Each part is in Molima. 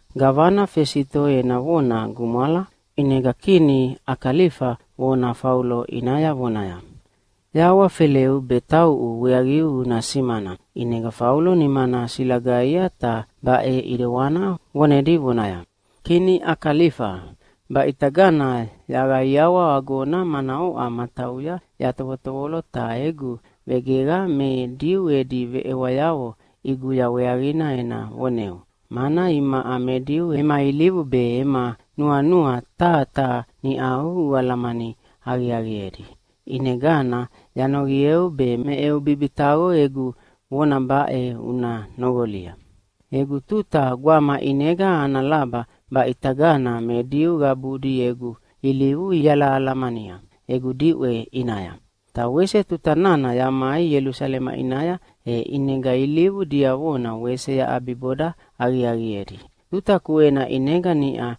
Gavana Fesito ena vona gumwala, ʼinega kini Akalifa vona Faulo ʼinaya vonaya, “Yahawafeleu be tauʼu weaqiu una simana.” ʼInega Faulo nimana silagaia ta baʼe ʼidewana vonedi vonaya, “Kini Akalifa, baʼitagana yaqaiawa agona mana oʼa matauya yatovotovolo ta egu vegeqa me Diu edi veʼewayavo ʼiguya weaqina ena voneu, mana imaʼa me Diu ema ilivu be ema nuanua taha taha niʼau ualamani aqiaqiedi. ʼInegana yanoqieu be me eu bibitaqo egu vona baʼe una noqolia. “Egu tuta gwama ʼinega ana laba baʼitagana me Diu qabudi egu ilivu ialahalamania egu diʼwe ʼinaya. Ta wese tuta nana yamai Ielusalema ʼinaya e ʼinega ilivu diavona wese yaʼabiboda aqiaqiedi. Tuta kuena ʼinega niʼa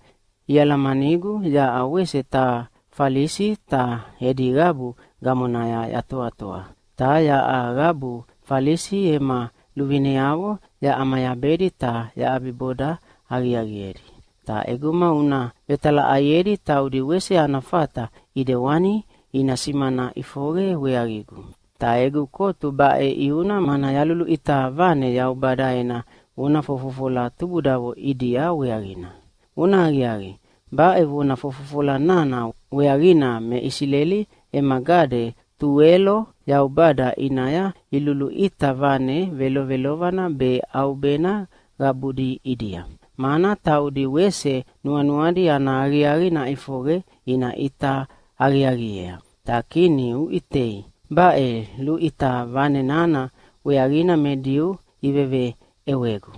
ialamanigu yaʼa wese taha Falisi ta edi qabu gamonaya yatoatoa, ta yaʼa qabu Falisi ema luvineavo yaʼamayabedi ta yaʼabiboda aqiaqiedi. Ta ʼeguma una vetalaʼaiedi taudi wese ana fata ʼidewani ina simana ʼifoqe weaqigu. Ta egu kotu baʼe ʼiuna mana yaluluʼita vane Yaubada ena vona fofofola tubudavo ʼidia weaqina. Vonahaqiaqi, baʼe vona fofofola nana weaqina me Isileli ema gade tuwelo Yaubada ʼinaya iluluʼita vane velovelovana be ʼaubena qabudi ʼidia, mana taudi wese nuanuadi ana aqiaqi naʼifoqe ina ʼita aqiaqiea. Ta kini uʼitei, baʼe luʼita vane nana weaqina me Diu iveveʼewegu.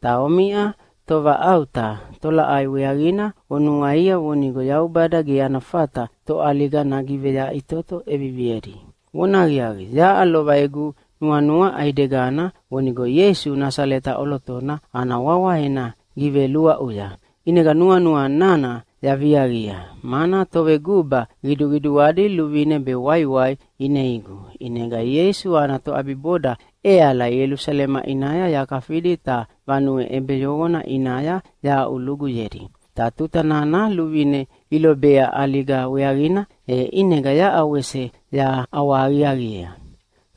Ta omiʼa tovaʼauta, tolaʼai weaqina onuaia vonigo Yaubada ge ana fata toʼaliga nagiveyaʼitoto ʼeviviedi? “Vonahaqiaqi, yaʼa lova egu nuanua ʼaidegana vonigo Ieisu Nasaleta ʼolotona ana wawa ena giveluaʼuya. ʼInega nuanua nana yaviaqia, mana toveguba qiduqiduadi luvine be waiwai ineigu, ʼinega Ieisu ana toʼabiboda ʼeala Ielusalema ʼinaya yakafidi ta vanue ʼebeyoqona ʼinaya yahaʼuluguyedi. Ta tuta nana luvine ilobea ʼaliga weaqina, e ʼinega yaʼa wese yaʼawahaqiaqiea.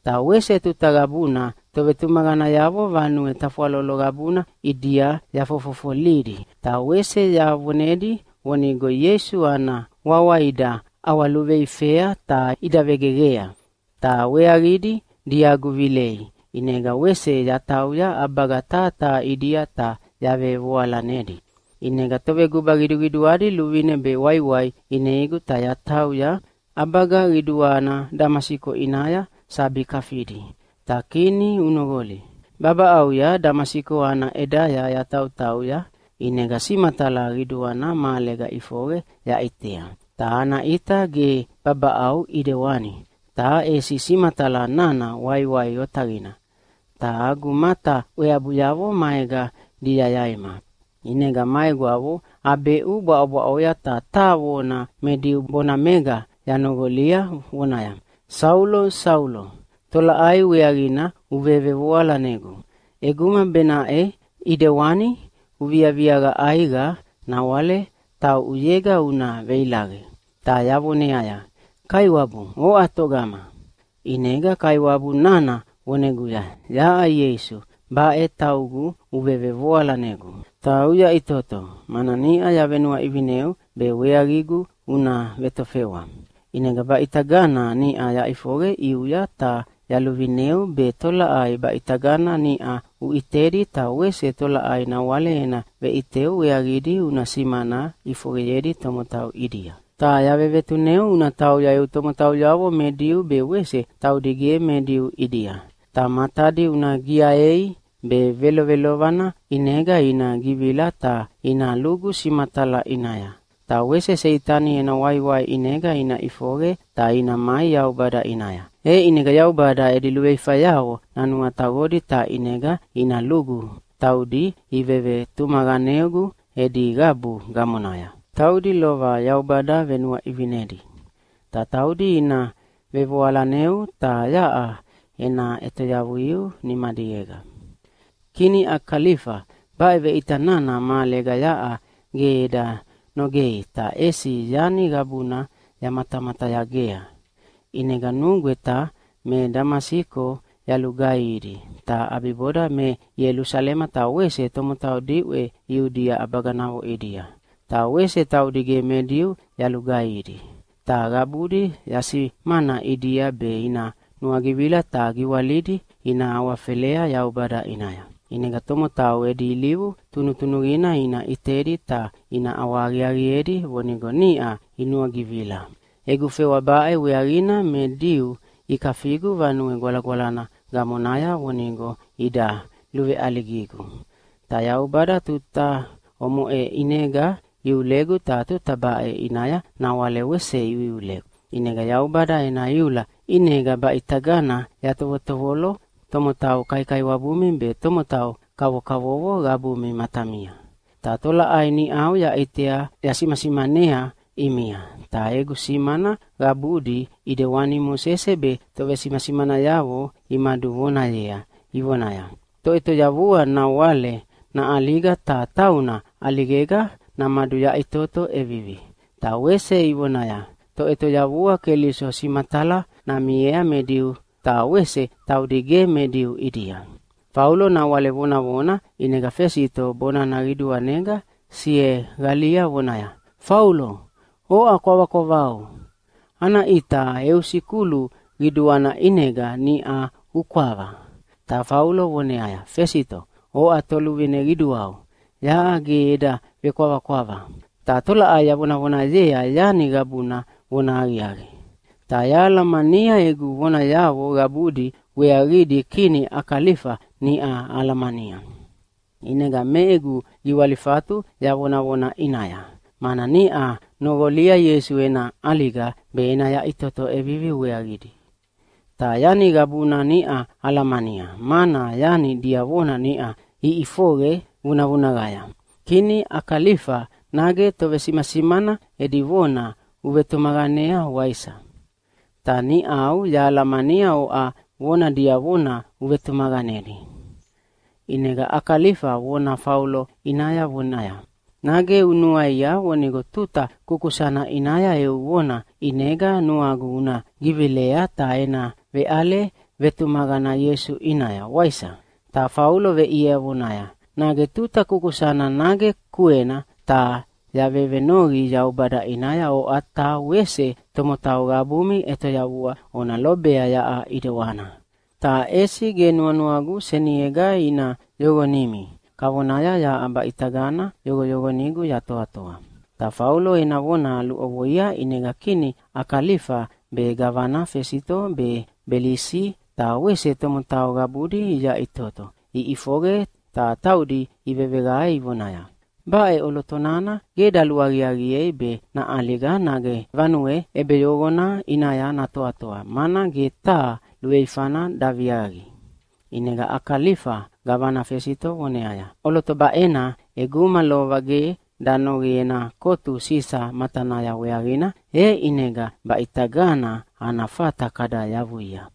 Ta wese tuta qabuna tovetumaqanayavo vanue tafwalolo qabuna ʼidia yafofofolidi ta wese yavonedi vonigo Ieisu ana wawa ida ʼawaluveifea ta ida vegeqea. Ta weaqidi diagu vilei, ʼinega wese yatauya ʼabaga taha taha ʼidia ta yavevoalanedi. “ʼInega toveguba qiduqiduadi luvine be waiwai ineigu ta yatauya ʼabaga qiduana Damasiko ʼinaya sabi kafidi. Ta kini unoqoli, babaʼauya Damasiko ana ʼedaya yatautauya, ʼinega simatala qiduana mahalega ʼifoqe yaʼitea. Ta ana ʼita ge babaʼau ʼidewani, ta ʼesi simatala nana waiwai otaqina, ta agu mata ʼweabuyavo maega diayaima. ʼInega ma egwavo abeʼu bwaʼobwaʼoya ta taha vona me Diu bonamega yanoqolia vonaya, ‘Saulo, Saulo, tolaʼai weaqina uvevevoalanegu? ʼEguma benaʼe ʼidewana uviaviaqa ʼaiqa nawale tauʼuyega una veilaqe.’ “Ta yavoneaya, ‘Kaiwabu, oʼa togama?’ “ʼInega Kaiwabu nana voneguya, ‘Yaʼa Ieisu, baʼe taugu uvevevoalanegu. Ta uyaʼitoto, mana niʼa yavenuaʼivineu be weaqigu una vetofewa. ʼInega baʼitagana niʼa yaʼifoqe ʼiuya ta yaluvineu be tolaʼai baʼitagana niʼa uʼitedi ta wese tolaʼai nawale ena veʼiteu weaqidi una simana ʼifoqeyedi tomotau ʼidia. Ta yavevetuneu una tauya eu tomotauyavo me Diu be wese taudi ge me Diu ʼidia. Ta matadi una giaei be velovelovana ʼinega ina givila ta ina lugu simatala ʼinaya, ta wese Seitani ena waiwai ʼinega ina ʼifoqe ta ina mai Yaubada ʼinaya. E ʼinega Yaubada edi luveifayavo nanuataqodi ta ʼinega ina lugu taudi ivevetumaqanegu edi qabu gamonaya, taudi lova Yaubada venuaʼivinedi. Ta taudi ina vevoalaneu, ta yaʼa ena ʼetoyavuiu nimadiega.’ “Kini Akalifa, baʼe veʼita nana mahalega yaʼa ge eda nogei ta ʼesi yani qabuna yamatamatayagea. ʼInega nugweta me Damasiko yalugaihidi, ta ʼabiboda me Ielusalema ta wese tomotau diʼwe Iudia ʼabaganavo ʼidia. Ta wese taudi ge me Diu yalugaihidi. Ta qabudi yasimana ʼidia be ina nuagivila ta giwalidi ina awafelea Yaubada ʼinaya. ʼInega tomotau edi ilivu tunutunuqina ina ʼitedi ta ina ʼawahaqiaqiedi vonigo niʼa inuagivila. Egu fewa baʼe weaqina me Diu ikafigu Vanue Gwalagwalana gamonaya vonigo ida luveʼaligigu. Ta Yaubada tuta omoʼe ʼinega iulegu ta tuta baʼe ʼinaya nawale wese iuiulegu. ʼInega Yaubada ena iula ʼinega baʼitagana yatovotovolo tomotau kaikaiwabumi be tomotau kavokavovo qabumi matamia. Ta tolaʼai niʼau yaʼitea yasimasimanea ʼimia, ta egu simana qabudi ʼidewani Mosese be tovesimasimanayavo imaduvonayea ivonaya, ‘Toʼetoyavua nawale naʼaliga ta tauna ʼaligega namaduyaʼitoto ʼevivi.’ Ta wese ivonaya, ‘Toʼetoyavua Keliso simatala namiea me Diu, ta wese taudi ge me Diu ʼidia.’” Faulo nawale vonavona, ʼinega Fesito bonana qiduanega sieqalia vonaya, “Faulo oʼa kwavakwavau! Ana ʼita eu sikulu qiduana ʼinega niʼa ukwava.” Ta Faulo voneaya, “Fesito, oʼa toluvine qiduau, yaʼa ge eda vekwavakwava. Ta tolaʼai yavonavonayea yani qabuna vonahaqiaqi. Ta yahalamania egu vonayavo qabudi weaqidi kini Akalifa niʼa alamania. ʼInega me egu giwalifatu yavonavona ʼinaya, mana niʼa noqolia Ieisu ena ʼaliga be ena yaʼitoto ʼevivi weaqidi. Ta yani qabuna niʼa alamania, mana yani diavona niʼa iʼifoqe vunavunaqaya. Kini Akalifa, nage tovesimasimana edi vona uvetumaqanea, waisa? Ta niʼau yahalamania oʼa vona diavona uvetumaqanedi!” ʼInega Akalifa vona Faulo ʼinaya vonaya, “Nage unuaia vonigo tuta kukusana ʼinaya eu vona ʼinega nuagu una givilea ta ena veʼale vetumaqana Ieisu ʼinaya, waisa?” Ta Faulo veʼiea vonaya, “Nage tuta kukusana nage kuena, ta yavevenoqi Yaubada ʼinaya oʼa ta wese tomotau qabumi ʼetoyavua ona lobea yaʼa ʼidewani, ta ʼesi ge nuanuagu seniega ina yoqonimi kavona yaʼa baʼitagana yoqoyoqonigu yatoatoa.” Ta Faulo ena vona luʼovoia, ʼinega kini Akalifa be gavana Fesito be Belisi ta wese tomotau qabudi iyaʼitoto iʼifoqe ta taudi iveveqae ivonaya, “Baʼe ʼoloto nana ge daluaqiaqiei be naʼaliga nage vanue ʼebeyoqona ʼinaya natoatoa, mana ge taha luveifana daviaqi.” ʼInega Akalifa gavana Fesito voneaya, “ʼOloto baʼena ʼeguma lova ge danoqi ena kotu Sisa matanaya weaqina, e ʼinega baʼitagana ana fata kada yavuia.”